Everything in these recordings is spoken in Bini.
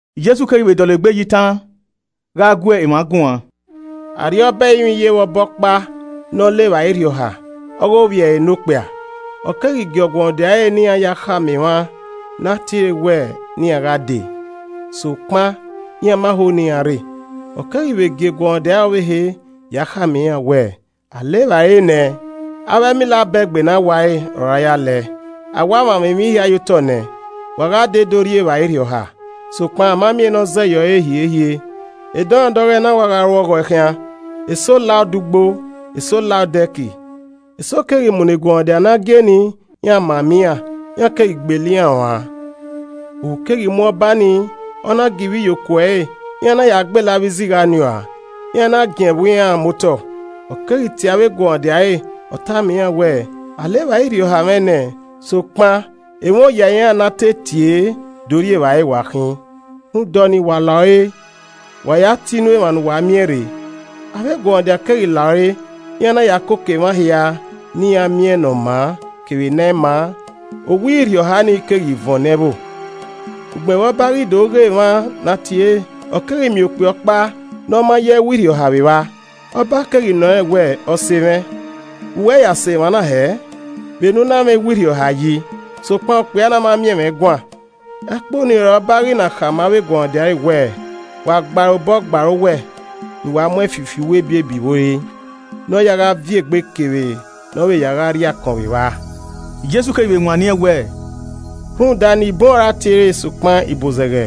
Jesu keghi vbe dọlegbe ya itan gha gu emwa guan. “Arriọba ẹrinmwi yevbe ọba ọkpa ne ọ le evbare irhiọha ọghe ovbi ẹre nokpia. Ọ keghi gie eguọmwadia ẹre ne iran ya khama emwa ne a tiere wẹ ne iran gha dee. Sokpan, iran ma ho ne iran rre. Ọ keghi vbe gie eguọmwadia ọvbehe ya khama iran wẹẹ, ‘A le evbare nẹ, avbe ẹmila abẹgbe ne a ware, ọre a ya le ẹe, a wa mwamwa emwi hia ye otọ nẹ. Wa gha dee do rri evbare irhiọha’, sokpan a ma miẹn ne ọ zẹ ye ọre hiehie, edọmwadẹ ọghọe na wa gha ru ọghọe khian, eso la odẹ ugbo, eso la odẹ ẹki. Eso keghi munọ eguọmwadia ne a gie nii, iran mama iran, iran keghi gbele iran ruan. Ohu keghi mu ọba ni, ọ na gie ivbiyokuo ẹre, iran na ya gbele avbe izigha ni uan, iran na giẹn ẹvbo iran muotọ. Ọ keghi tie avbe eguọmwadia ẹre, ọ tama iran wẹẹ, ‘A le evbare irhiọha mwẹ nẹ, sokpan emwa oya iran na a te tie do rri evbare wa khin. Rhunmwuda ọnii, wa la ore, wa ya tie inu emwa ne uwa miẹn rre.’ Avbe eguọmwadia keghi la ore, iran na ya koko emwa hia ne iran miẹn ne ọ maa, kevbe ne ẹ i maa, owa irhiọha ni keghi vuọn ne ẹvbo. “Ugbẹn vbe ọba ghi do ghe emwa ne a tiere, ọ keghi miẹn ọkpia ọkpa ne ọ ma yọ ẹwu irhiọha vbe evba. Ọba keghi nọ rẹn wẹẹ, ‘Ọse mwẹ, vbe uwẹ ya sẹ emwa na hẹ vbe ne u i na mwẹ ẹwu irhiọha yi?’ Sokpan okpia na ma miẹn ẹmwẹ guan. Ẹkpo nii ọre ọba ghi na khama avbe eguọmwadia ẹre wẹẹ, ‘Wa gba ẹre obọ gba ẹre owẹ, ne uwa mu ẹn fi uwu ebiebi vbe ore, ne ọ ya gha viẹ egbe kevbe ne ọ ya gha rri akọn vbe evba.’” Jesu keghi vbe wanniẹn wẹẹ, “Rhunmwuda, ni bun ọre a tiere sokpan ibozẹghe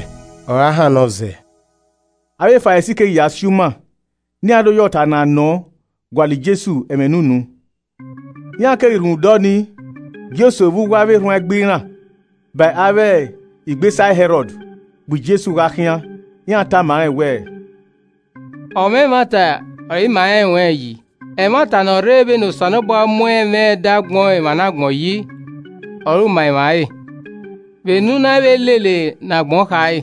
ọre a hannọ zẹ.” Avbe Farisi keghi ya si uma ne iran do ya ọta ne a nọ gualọ Jesu ẹmwẹ ne unu. Iran keghi rhunmwuda ọnii gie eso vbe uwu avbe erhuanegbe iran ba avbe igbesa Hẹrọd bu Jesu gha khian. Iran tama rẹn wẹẹ, “Ọmwa ẹmwata ọre ima rẹn ruẹn yi, ẹmwata ne ọ rre vbene Osanobua mu ẹmwẹ ẹdẹ agbọn emwa ne agbọn yi, ọre u ma emwa re, vbe ne u i na vbe lele ne agbọn khare,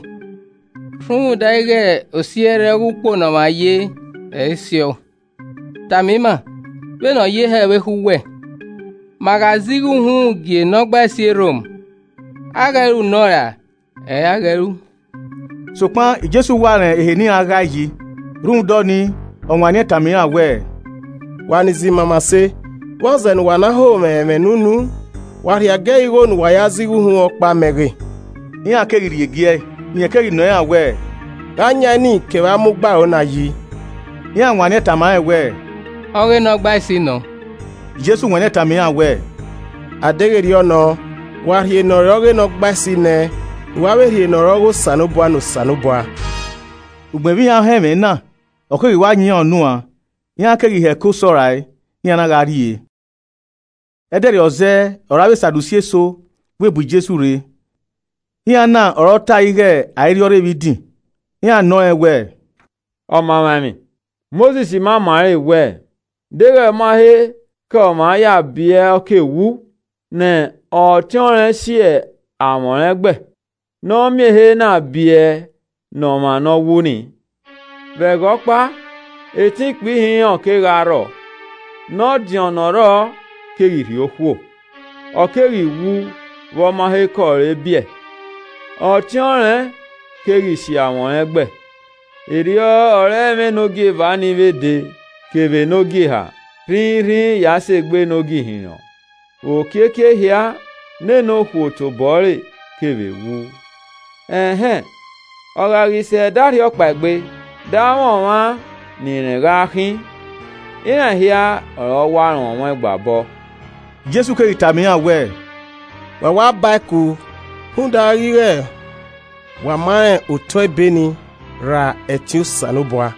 rhunmwuda ighe osi ẹrrẹe ọghe ukpo ne ọmwa ye, ẹ i si ọ. Tama ima vbene ọ ye hẹ vbe ekhọe uwẹ. Ma gha zẹ igho uhunmwu gie Nọgbaisi e Rom, a ghẹ ru nọ ra ẹ i re a ghẹ ru?” Sokpan Jesu wa rẹn ehe ne iran ghae yi, rhunmwuda ọnii, ọ wanniẹn tama iran wẹẹ, “Wa ni zẹ imamase, vbọzẹ ne uwa na ho mwẹ ẹmwẹ ne unu? Wa rhie agiẹghẹ igho ne uwa ya zẹ igho uhunmwu ọkpa mẹ ghe.” Iran keghi rhie gie ẹe. Rẹn keghi nọ iran wẹẹ, “Gha ọ yan eni kevbe ama ugbaro na yi?” Iran wanniẹn tama rẹn wẹẹ, “Ọ ghe Nọgbaisi nọ” Jesu wanniẹn tama iran wẹẹ, “A deghẹ erriọ nọ, wa rhie ne ọre ọghe Nọgbaisi ne ẹn ne uwa vbe rhie ne ọ re ọghe Osanobua ne Osanobua.” Ugbẹn vbe iran họn ẹmwẹ na, ọ keghi wa yan iran unu an, iran keghi hẹko sọ rae, iran na gha rrie. Ẹdẹrriọ zẹẹ ọre avbe Sadusi eso vbe bu Jesu rre, (Iran na ọre ọ tae ighe a i rhiọrre vbe idin.) Iran nọ rẹn wẹẹ, “Ọmamwaemwi, Mosis ma ima ẹre wẹẹ, ‘Deghẹ ọ ma he kẹ ọmwa ya biẹ ọ ke wu, ne ọtẹn ọnrẹn si amwẹ ọnrẹn ẹgbẹ, ne ọ miẹn ehe na biẹ ne ọmwa ne ọ wu nii.’ Vbe ẹghẹ ọkpa, etẹn ikpia ihinrọn kegha rrọọ. Ne ọdiọn ne ọ rrọọ keghi rhie okhuo, ọ keghi wu vbe ọ ma he kẹ ọre biẹ, ọtẹn ọnrẹn keghi si amwẹ ọnrẹn ẹgbẹ. Erriọ ọre ẹmwẹ ne ogieva ni vbe de, kevbe ne ogieha rhinrin ya sẹ egbe ne ogihinrọn. Vbe okiekie ehia, nene okhuo tobọ ẹre kevbe wu. Ẹn hẹn, ọ gha ghi sẹ ẹdẹ arhiọkpaegbe, de amwẹ ọmwa ne irẹn ghaa khin! Iran hia ọre ọ wa rọnmwẹ ọẹn gba obọ.” Jesu keghi tama iran wẹẹ, “Wa wa bae ku rhunmwuda ighe wa ma rẹn otọe Ebe nii, ra ẹtin Osanobua.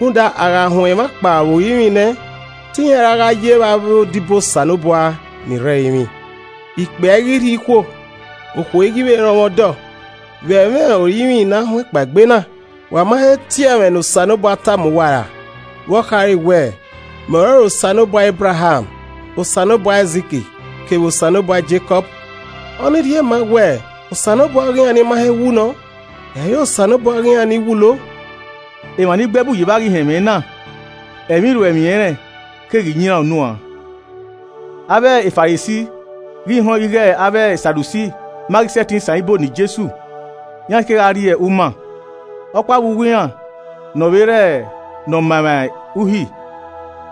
Rhunmwuda a gha huẹn emwa kpao vbe orinmwi nẹ te iran ra gha ye vbe avbe odibo Osanobua ni rre ẹrinmwi, okpia i ghi rhie okhuo, okhuo i ghi vbe rọnmwẹ ọdọ. Vbe ẹmwẹ orinmwi ne a huẹn kpaegbe na, wa ma he tie ẹmwẹ ne Osanobua tama uwa ra? Vbe ọ khare wẹẹ, ‘Mẹ ọrọre Osanobua Ebraham, Osanobua Aizik kevbe Osanobua Jekọb!’ Ọ ni rhie maa wẹẹ Osanobua ọghe iran ni ma he wu nọ, ẹ i re ọghe ni wulo.” Emwa ni gbe ẹbu ye vba ghi họn ẹmwẹ na, ẹmwẹ iruẹemwi ẹnrẹn keghi yan iran unu uan. Avbe Farisi ghi họn ighe avbe Sadusi ma ghi sẹtin san ibo ne Jesu, iran kegha rrie uma. Ọkpa vbe uwu iran ne ọ vbe re ne ọ ma emwa Uhi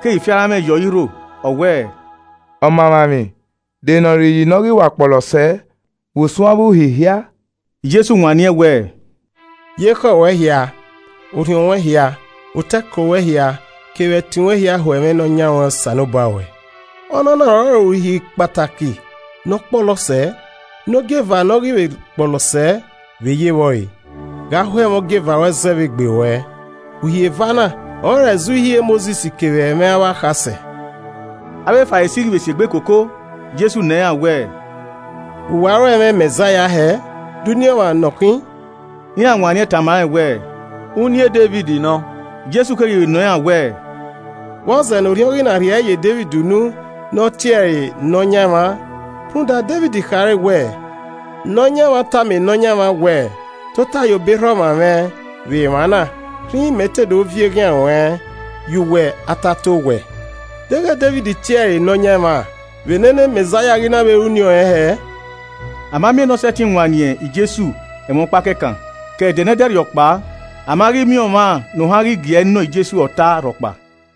keghi fi aranmwẹ ye ọre irho, ọ wẹẹ, “Ọmaemwaemwi, de ne ọre iyi nọ ghi wa kpọlọ sẹẹ vbe usun avbe Uhi hia?” Jesu wanniẹn wẹẹ, “ ‘Ye ekhọe ruẹ hia, orhiọn ruẹn hia, otọe ẹko ruẹ hia, kevbe ẹtin ruẹn hia ho ẹmwẹ Nọyan ruẹn Osanobua ruẹ.’ Ọnọna ọrọre uhi kpataki ne ọ kpọlọ sẹẹ. Ne ogieva ne ọ ghi vbe kpọlọ sẹẹ vbe ye vbe ọre: ‘Gha ho ẹmwẹ ogieva ruẹ zẹ vbe egbe ruẹ.’ Uhi eva na ọrọre ẹzi Uhi e Mosis kevbe ẹmwẹ avbe akhasẹ.” Avbe Farisi ghi vbe si egbe koko, Jesu nọ iran wẹẹ, “Vbe uwa ro ẹmwẹ e Mẹzaia hẹ? De uniẹn ọmwa ne ọ khin?” Iran wanniẹn tama rẹn wẹẹ, “Uniẹn Devid nọ.” Jesu keghi vbe nọ iran wẹẹ, “Vbọzẹ ne Orhiọn ghi na rhie ẹre ye Devid unu ne ọ tie ẹre ‘Nọyaẹnmwa?’ Rhunmwuda Devid khare wẹẹ, “ ‘Nọyaẹnmwa tama Nọyaẹnmwa wẹẹ: Tota ye obọ erha ọmwa mwẹ vbe emwa na, rhinrin mẹ te do viọ eghian ruẹn ye uwẹ atataowẹ.’ Deghẹ Devid tie ẹre ‘Nọyaẹnmwẹ,’ vbe nene Mẹzaia ghi na vbe re uniẹn ọnrẹn hẹẹ?” A ma miẹn ne ọ sẹtin wanniẹn Jesu ẹmwẹ ọkpa kẹkan, ke ẹdẹ ne ẹdẹrriọ kpao, a ma ghi miẹn ọmwa ne ohan ghi gie ẹe nọ Jesu ọta rhọkpa.